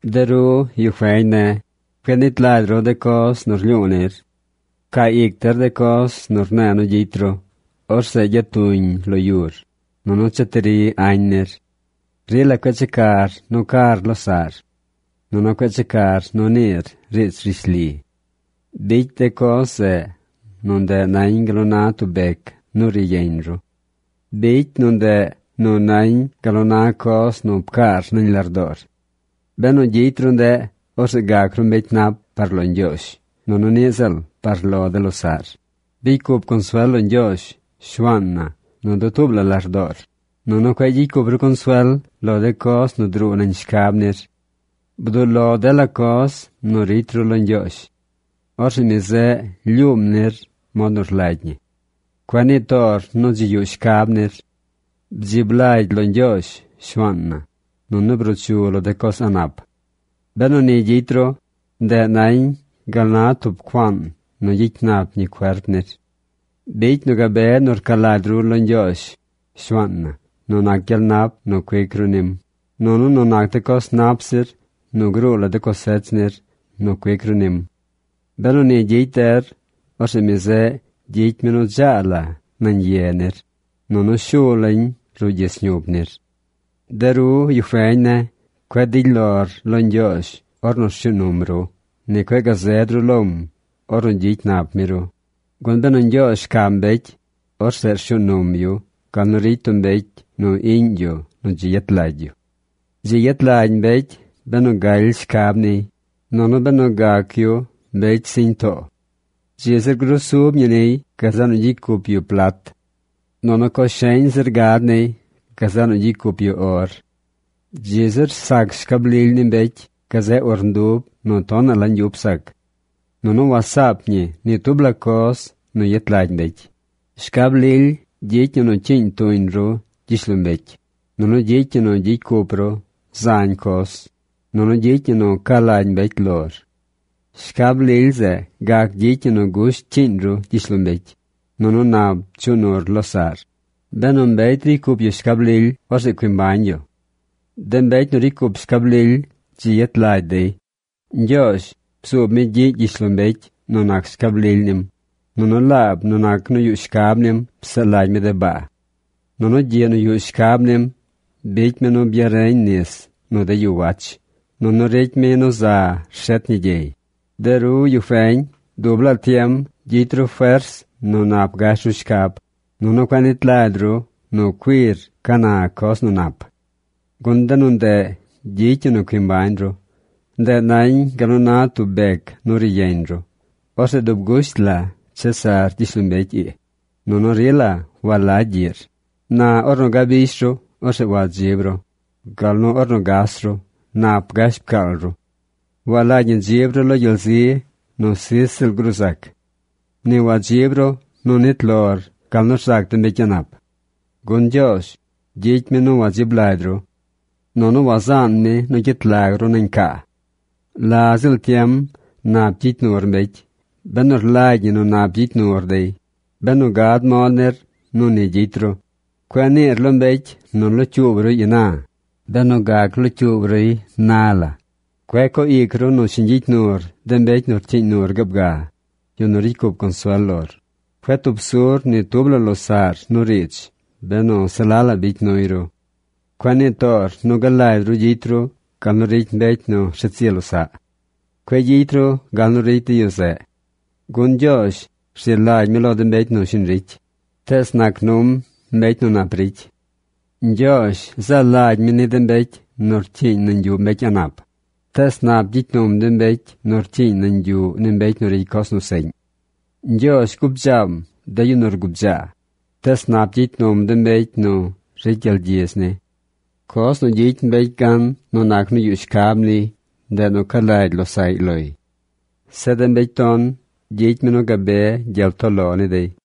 De ru, yu feñ ne̱, cueꞌ nit lagy ru de coz nu rlyu̱u̱ nir. Pcaa ic der de coz nu rne̱e̱ nu gyicy ru. Orzeꞌ gyatuñ lo yur, nunu cheti ri añ nir. Rila cueꞌ checar nu car losaꞌr, nunu cueꞌ checar nu niir riidz rishli. Bicy de coz zeꞌ nu ndeꞌ nañ gal nu na tub bec nu ri yeñ ru. Bicy nu ndeꞌ nu nañ gal nu na coz nu pcaar nañ lardoor. Benu gyicy ru ndeꞌ, orzeꞌ gac ru mbecy nap par lo Ñgyoozh nunu niꞌ ziꞌl par lo de losaꞌr. Bicy cup consuel lo Ñgyoozh Shuaan na nu dutuub lardoor, nunu cueꞌ gyicy cup ru consuel lo de coz nu druu nañ shcab nir. Bduꞌ lo dela coz nu ricy ru lo Ñgyoozh. Orzeꞌ mi zeꞌ lyuum nir mod nu rlagy ñi. Cueꞌ nii toor nu dzi yuꞌ shcab nir. Bdzib lagy lo Ñgyoozh, Shuaan na, nunu bruu chu lo de coz a̱ꞌ nap. Benu ni gyicy ru, ndeꞌ nañ gal na tub cuaan nu gyicy nap ñi cuerp nir. Bicy nu gabe nu rca lagy ru lo Ñgyoozh, Shuaan na nu nac gyel nap nu cuic ru nim, nunu nu nac de coz nap zir nu gruu lo de cosech nir nu cuic ru nim. Benu ni gyicy der, orzeꞌ mi zeꞌ gyicy mi nu dzaa la nañ ye nir, nunu shu lañ ruꞌ gyis ñup nir. De ru, yu feñ ne̱, cueꞌ dily lor lo Ñgyoozh ornu rshuu num ru. Ni cueꞌ gazeed ru lom ornu gyicy nap mi ru, gun benu Ñgyoozh rcam mbecy, orzeꞌ shuu num yu gal nu ricy tub mbecy nu iꞌñ yu nu dzi yet lagy yu. Dzi yet lagy mbecy benu galy shcab niy, nunu benu gac yu mbecy siñ too. Dzi zir grusub ñi niy gazeꞌ nu gyicy cup yu plat. Nunu coz sheñ zir gad niy gazeꞌ nu gyicy cup yu or. Dzi zir sac shcab lily ni mbecy gazeꞌ urndub nu tonaꞌ la ñgyup sac. ¡Nunu wasaap ñi ni tub la coz nu yet lagy mbecy! Shcab lily gyicy ñi nu cyiiñ tuñ ru gyishlombecy, nunu gyicy ñi nu gyicy cup ru zañ coz, nunu gyicy ñi nu ca lagy mbecy lor. Shcab lily zeꞌ gac gyicy ñi nu gusht cyiiñ ru gyishlombecy, nunu nap chuꞌ nur losaꞌr. Benu mbecy ricy cup yu shcab lily, orzeꞌ cui mbañ yu. ¡De mbecy nu ricy cup shcab lily dzi yet lagy dey! Ñgyoozh bzuub mi gyiꞌ gyishlombecy nu nac shcab lily nim, nunu laab nu nac nu yuꞌ shcab nim psaꞌ lagy mi de baa. Nunu gyiꞌ nu yuꞌ shcab nim bicy mi nu byareñ nis nu de yu wach, nunu ricy mi nu za rshet ñi gyey. De ru, yu feñ, dub laa tiem gyicy ru fers nu nap gash ru shcab, nunu cueꞌ nit lagy ru nu cuir ca na coz nu nap. Gun de nu nde gyicy ñi nu cui mbañ ru. Ndeꞌ nañ gal nu na tub bec nu ri yeñ ru. Orzeꞌ dub gusht la chesar gyishlombecy ii, nunu rila walagy gyiꞌr. Na ornu gabish ru, orzeꞌ wadzib ru, gal nu ornu gas ru, nap gash pcaal ru. Walagy ñi dzib ru lo gyel zi nu sij ziꞌl gruu zac. Ni wadzib ru nu nit lor gal nu rzac de mbecy a̱ꞌ nap. Gun Ñgyoozh gyicy mi nu wadzib lagy ru, nunu wazaan mi nu gyet lag ru nañ caa. La ziꞌl tiem nap gyicy nur mbecy benu rlagy ñi nu nap gyicy nur dey, benu gad mod nir nu ni gyicy ru. Cueꞌ niir lo mbecy nu locyuub ruy ina benu gac locyuub ruy na la. Cueꞌ co ic ru nu shiñ gyicy nur de mbecy nu rcyiiñ nur gaab ga, yu nu ricy cup consuel lor. Cueꞌ tub sur ni tub la losaꞌr nu riidz benu se la la bicy nuy ru. Cueꞌ nii toor nu galagy ru gyicy ru gal nu ricy mbecy nu rshet zi losaꞌ. Cueꞌ gyicy ru gal nu ricy de yu zeꞌ, gun Ñgyoozh rzi lagy mi lo de mbecy shiñ ricy, tees nac num mbecy nu nap ricy. Ñgyoozh zaa lagy mi ni de mbecy nu rcyiiñ nañ yuꞌ mbecy a̱ꞌ nap, tees nap gyicy num de mbecy nu rcyiiñ nañ yuꞌ ni mbecy nu ricy coz nu seꞌñ. Ñgyoozh gubdzaam de yu nu rgubdzaa, tees nap gyicy num de mbecy nu ricy gyel gyidz ni. Coz nu gyicy mbecy nu yuꞌ shcab gan, ndeꞌ nu ca lagy losaꞌy loy. Zeꞌ de mbecy ton, gyicy mi nu gabe gyel too lo ni dey.